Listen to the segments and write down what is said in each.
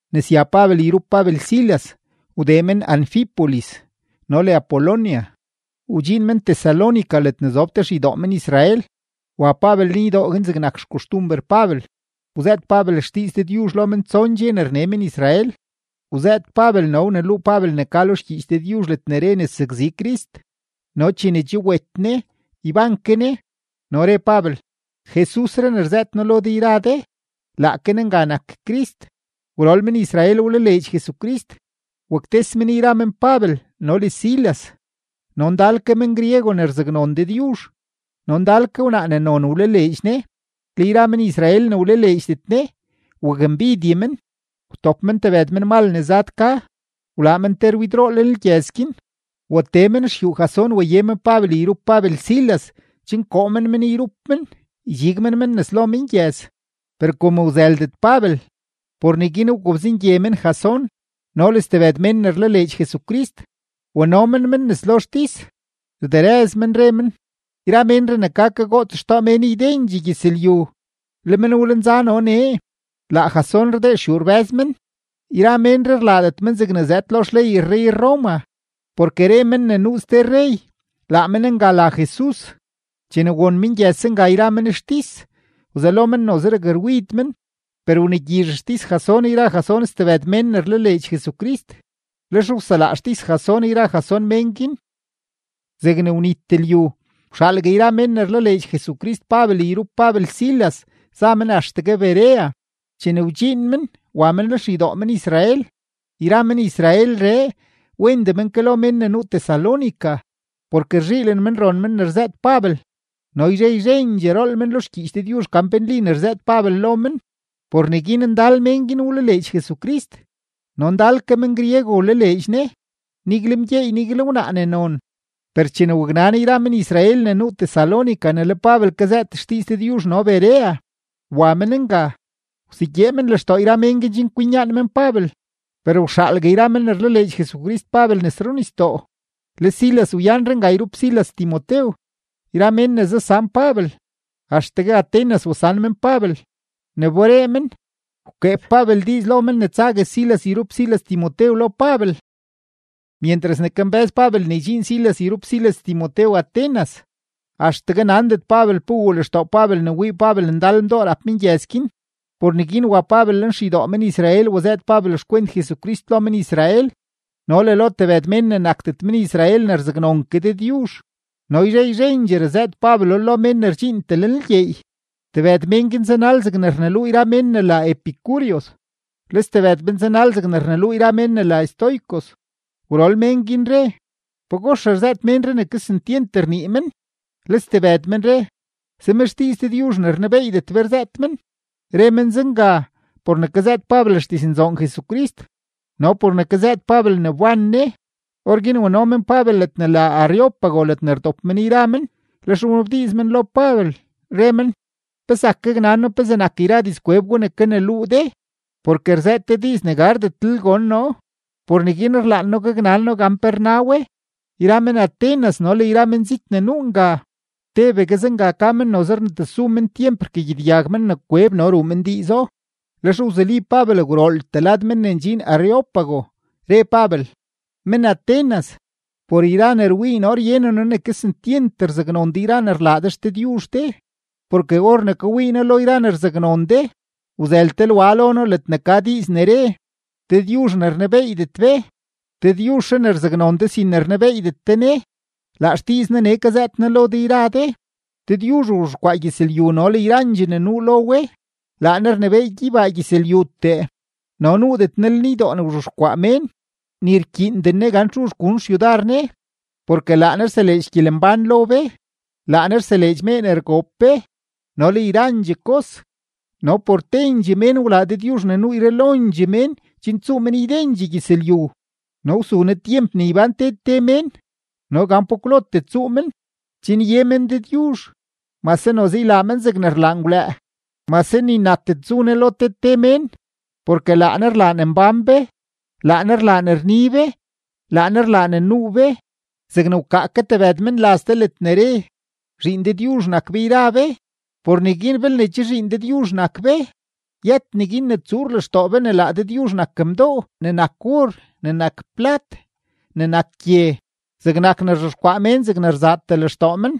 Ne sya Pabel yrup Pabel Silas, wdee men Anfípolis no le Apolonia, wdxiin men Tesalónica ledne zob te xeydoo men-Israel. Wa Pabel lenydoo guin zegnak xkoxtumber Pabel, wzëët Pabel xdiiz Dëdyuzh lo men tson dxe ne rne men-Israel. Wzëët Pabel no wluu Pabel ne ka lo xgyiich Dëdyuzh ledne re ne sakzi Crist no chene che wet Ne, yban ke Ne. No re Pabel: ―Jesusree ne rzëët noo lo de yra de, laake Ne nga nak Crist. Gwrol men-Israel wlaleedx Jesucrist, waktes men yra men Pabel no le Silas. No ndal ke men-griego ne rzaknon Dëdyuzh no ndal ke wnaa ne non wlaleedx Ne. Le yra men-Israel ne wlaleedxdet Ne, wakmbidye men; wtop men tebëd menmal ne zad ka, wlaa men te rwidroo lenlgyëz guin. Watee men xyuu Jasón, waye men Pabel yrup Pabel Silas chen koo men men yrup men, ydxig men men nes lo mengyëz. Per kom wzëldet Pabel, por neguin wgobzengye men Jasón no le stebëd mén ne rlaleedx Jesucrist, wano men men nes lo xtis. Rderëz men, re men: ―Yra ménree ne ka kagoots xtoo mén ydendxee gyëzlyu, le men wlenza no nee. Laa Jasón rdee ruxyuu rbë́z men. Yra ménree rlaadet men zegne zëëd lo xley rrey-Roma, porke re men ne nuu ste rrey, laa men nga la Jesus. Chene won mengyëz zenga yra men xtis, wzelo men noze rakrwid men. Per wnegyizh xtis Jasón yra Jasón stebëd mén ne rlaleedx Jesucrist, lex wselaa xtis Jasón yra Jasón mén guin. Zegne wnit lyu, wxaalgue yra mén ne rlaleedx Jesucrist Pabel yrup Pabel Silas za men axtegue Berea. Chene wdxiin men, wa men lenxeydoo men-Israel. Yra men-Israelree, wendee men ke lo mén ne nuu Tesalónica, porke rzhiilen men ron men ne rzëët Pabel no yzhe yzhendxee rool men lo xgyiich Dëdyuzh gan pe nli ne rzëët Pabel lo men. Por neguin ndal mén guin wlaleedx Jesucrist no ndal ke men-griego wlaleedx Ne, nigle mgyeey, nigle wnaa ne non. Per chene waknan yra men-Israel ne nuu Tesalónica ne le Pabel kazëët xdiiz Dëdyuzh no Berea, wa men nga, wsegyee men lextoo yra mén guin chen kwinyaan men Pabel. Per wxaalgue yra men ne rlaleedx Jesucrist Pabel nes runisdoo, le Silas wyanre nga yrup Silas Timotew. Yra mén ne zasan Pabel, axtegue Atenas wasan men Pabel. Ne wberee men, wkeeb Pabel diiz lo men ne tsague Silas yrup Silas Timotew lo Pabel. Myentras ne kambë́z Pabel ne ydxiin Silas yrup Silas Timotew Atenas, axtegue nandet Pabel pe wuu lextoo Pabel ne wii Pabel ndal mdoo rap mengyëz guin. Por neguin wa Pabel lenxeydoo men-Israel wazëët Pabel xkwent Jesucrist lo men-Israel no le lo tebëd mén ne nakdet men-Israel ne rzaknon ke Dëdyuzh, no yzhe yzhendxee razëët Pabelo lo mén ne rdxiintee lenlgyeey. Tebëd mén guin zanal zegne rneluu yra mén ne la epicúreos, le stebëd men zanal zegne rneluu yra mén ne la estoicos. Gwrol mén guin re: ―¿Pagox rzëët ménree ne kesentyent rnii men? Le stebëd men re: ―Zem xdiiz dëdyuzh ne rnebeeydet be rzëët men. Re men zenga, por ne kazëët Pabel xdiznzoon Jesucrist no por ne kazëët Pabel ne wban Ne. Orguin wano men Pabel ledne la Areópago ledne rdop men yra men, lex wnabdiiz men lo Pabel, re men: ―¿Pe zak gaknan noo pezee nak yra dizkweb gwa ne kaneluu de? Porke rzëët de diiz ne gardetlel gon noo; por neguin rlaan noo gaknan noo gan pe rna we. Yra men-Atenas no le yra menzit ne nuu nga, tebegue zenga ka men noze rnetesu men tyemp rkagyedyag men ne kweb no ruu men diizo. Lex wzuli Pabel gwrooltee lad men ne ndxin Areópago, re Pabel: ―Men-Atenas, por yra ne rwii noo ryenen noo ne kesentyent rzaknon de yra ne rlaa de xdëdyuzh de. Porke or ne kawii noo lo yra ne rzaknon de, wzël te lwa lo noo ledne ka diiz ne re: “Dëdyuzh ne rnebeeydet be”. Dëdyuzhree ne rzaknon de sin ne rnebeeydet de Ne, laa xdiiz Ne nee kazëët noo lo de yra de. ’Dëdyuzh wzhexkwaa gyëzlyu no le yrandxee ne nuu lo we, laa Ne rnebééy gyeybaa gyëzlyutee, no nuudet Ne lenydoo ne rzhexkwaa mén, ni rkyiinden Ne gan txu gun xyudar Ne, porke laa Ne rseleedx gyelembán lo be, laa Ne rseleedx mee ne rgoob be no le yrandxee kos. ’No por tendxee mén wlaa Dëdyuzh ne nuu yralondxee mén chen tsuu men ydendxee gyëzlyu, no wsu Ne tyemp ne ybán te te mén no gan pa kwlotee tsuu men, chen ye men Dëdyuzh, mase noze ylaa men zegne rlaa ngwlëë, mase ni natet zu Ne lo te te mén. Porke laa Ne rlaa ne mbán be, laa Ne rlaa ne rni be, laa Ne rlaa ne nuu be. Zegne wkaa ke tebëd menlaz de ledne re: “Zhiin Dëdyuzh nak be yra be.” Por neguin belne che zhiin Dëdyuzh nak be, yët neguin ne tsuur lextoo be ne laa Dëdyuzh nak mdoo ne nak or, ne nak plat, ne nak gye, zegnak ne rzhexkwaa mén zegne rzaatee lextoo men.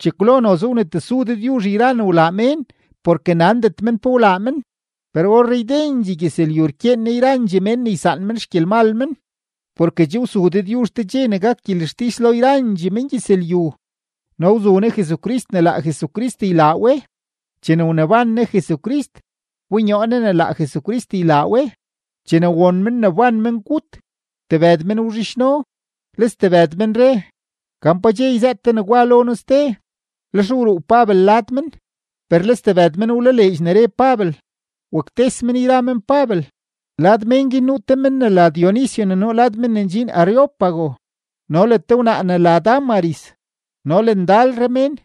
Chekwlo noze wnetesu Dëdyuzh yra ne wlaa mén porke nandet men pe wlaa men, per orree ydendxee gyëzlyu rkyeen Ne yrandxee mén ne ysaan men xgyelmal men. Porke che wsu Dëdyuzh te dxe ne gak gyelextis lo yrandxee mengyëzlyu no wzu Ne Jesucrist ne laa Jesucrist ylaa we. Chene wneban Ne Jesucrist, wbonyoo Ne ne laa Jesucrist ylaa we. Chene won men ne wban mengut, tebëd men wzhidxno, le stebëd men re: ―Gan pa dxe yzëët de negwa lo noo ste. Lex wruu Pabel lad men. Per le stebëd men wlaleedx ne re Pabel, waktes men yra men Pabel. Lad mén guin nuu te men ne la Dionisio ne nuu lad men ne ndxin Areópago, no le te wnaa ne la Dámaris, no le ndalre mén.